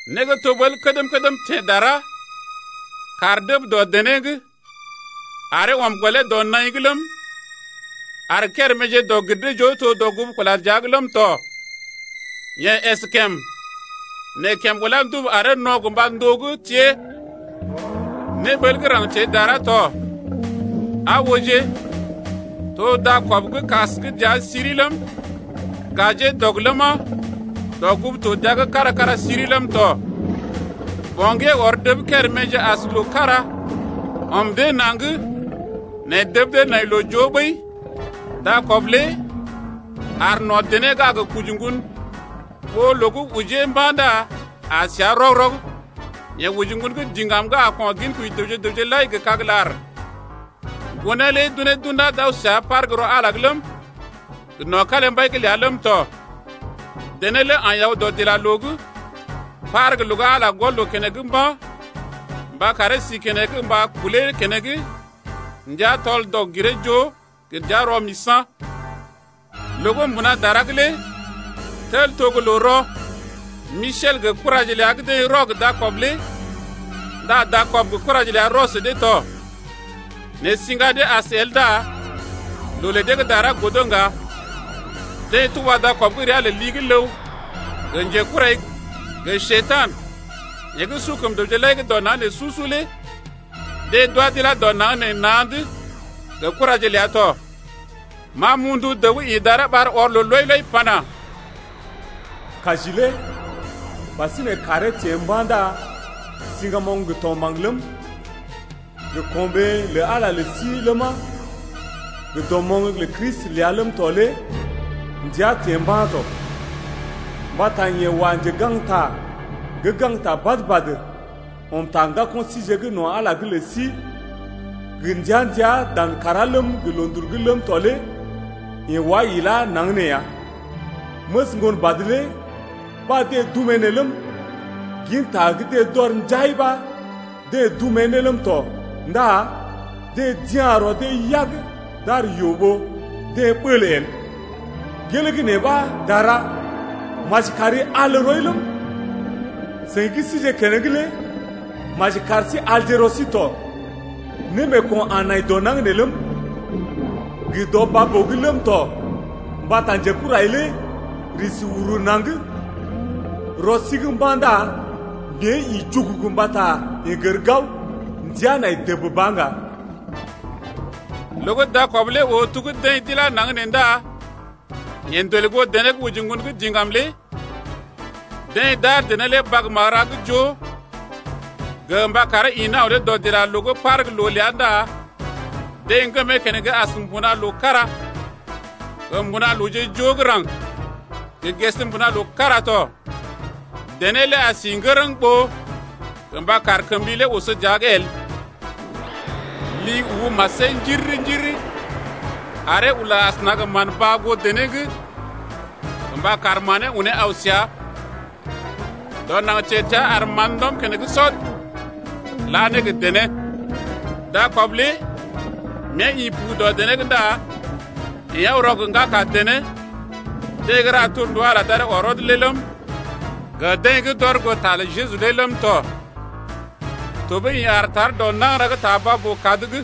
Né gə́ to ɓəl kədm-kədm teḛ dara: Kàr dəb dɔ dené’g aree ɔm gɔlee dɔ naḭ’g ləm, ar kéréméje dɔg-gir-dee-joo to dɔgugu kula dəa’g ləm tɔ. Yeḛ əskèm, nɛ kèm ulá ndubu aree no̰ gə mba ndóo gə́ tée. Néɓəl gə́ raŋg teḛ dara to: Aa ooje, to dakɔb gə́ kas gə́ dəa siri ləm, gajee dɔg ləma, dɔgugu to dəa’g kára-kára siri ləm tɔ. Ɓoŋgee ɔr dəb kéréméje as loo kára ɔm dee naŋg nɛ dəb dee nai loo-joo ɓəi. Dakɔb lé aar no̰ dené gə́ a gə koji ŋgon ɓó loo gə́ ojee mba̰ ndá a seá rɔg-rɔg. Yeḛ oji ŋgon gə́ diŋgam gə́ a ko̰ ginkoji dəwje gə raŋg lai gə́ kag-lar. Ŋgonee lé d’undá d’unee d’aw səa par gə́ rɔ Ala’g ləm, gə no̰ kalimbai’g ləa ləm tɔ. Dené lé aḭ aw dɔdilaloo’g par gə́ loo gə́ Ala gɔl loo keneŋ mba̰, mba karee si keneŋ mba kulee keneŋ ndəa tɔl-dɔg-giree-joo gə dəa rɔ-misa̰. Loo gə́ mbuna dara’g lé tel to gə́ loo-rɔ. Misel gə kuraje ləa deḛ rɔ gə dakɔb lé. Ndá dakɔb gə kuraje ləa rɔ sə dee tɔ nɛ siŋga dee as el ndá loo lə dee gə́ dara godo ŋga. Deḛ tuba dakɔb gə́ ria lə li-gə́-ləw gə Njekurai, yeḛ gə́ su kəm dəwje lai dɔ naŋg nee su-su lé deḛ d’wá d’ilá dɔ naŋg nee na̰’d gə kuraje ləa tɔ. Ma m’oo ndu dəw gə́ ḭ dara ɓar ɔr loo lɔi-lɔi pana: Kaji lé ɓasinè kàree teḛ mba̰ ndá siŋgamoŋ gə tɔgmbaŋ ləm, gə ko̰ɓee lə Ala lə sí ləma, gə dɔmoŋ lə Kristi ləa ləm tɔ lé ndəa teḛ mba̰ tɔ. Mbata yeḛ wa njegaŋgta gə́ gaŋgta badə-badə ɔm ta ŋgako̰ síje no̰ Ala’g lə sí gə ndəa-ndəa dan kàrá ləm gə loondul’g ləm tɔ lé yeḛ wá ilá naŋg nee ya. Məs Ŋgonbad lé ɓa deḛ dumee ne ləm, ginta gə́ deḛ d’ɔr njai ɓa deḛ dumee ne ləm tɔ ndá deḛ d’ya̰ rɔ dee yag d’ar yoo ɓó deḛ ɓəl el. Gelee gə́ nee ɓa dara, maji kari al rɔi ləm, seḭ gə́ sije keneŋ lé maji kar sí alje rɔ sí tɔ. Némeeko̰ a nai dɔ naŋg nee ləm, gə dɔ baa-boo’g ləm tɔ mbata njekurai lé risi uru naŋg rɔ sí’g mba̰ ndá mée ḭ jugugu mbata yeḛ gər gao, ndəa nai dəb ba ŋga. Loo gə́ dakɔb lé oo to gə́ deḛ d’ilá naŋg nee ndá yeḛ ndolè goo dené gə́ oji ŋgon gə́ diŋgam lé. Deḛ d’ar dené lé bag magəra gə́ joo gə mba karee ḭ aw ne dɔdilaloo’g par gə́ loo’g ləa ndá deḛ ŋgəm keneŋ as mbuna-loo kára, gə mbuna-looje gə́ raŋg, gə ges mbuna-loo kára tɔ. Dené lé a si ŋgərəŋ ɓó gə mba kar kəm li lé oso dəa’g el. Li lé ubu masee njiriri-njiriri aree ula asəna gə mán-baa goo dené’g gə mba kar manee unee aw səa. Dɔ naŋg teḛ təa ar mán ndɔm keneŋ sɔd la ne gə dené. Dakɔb lé mée ḭ pu dɔ dené’g ndá yeḛ aw rɔ gə ŋgaka dené lé, deḛ gə́ ra torndu Ala d’aree ɔr rɔd lé ləm, gə deḛ d’ɔr goo ta lə Jeju lé ləm tɔ. Tɔɓəi yeḛ aar tar dɔ nagəra gə́ ta baa-boo-kad’g.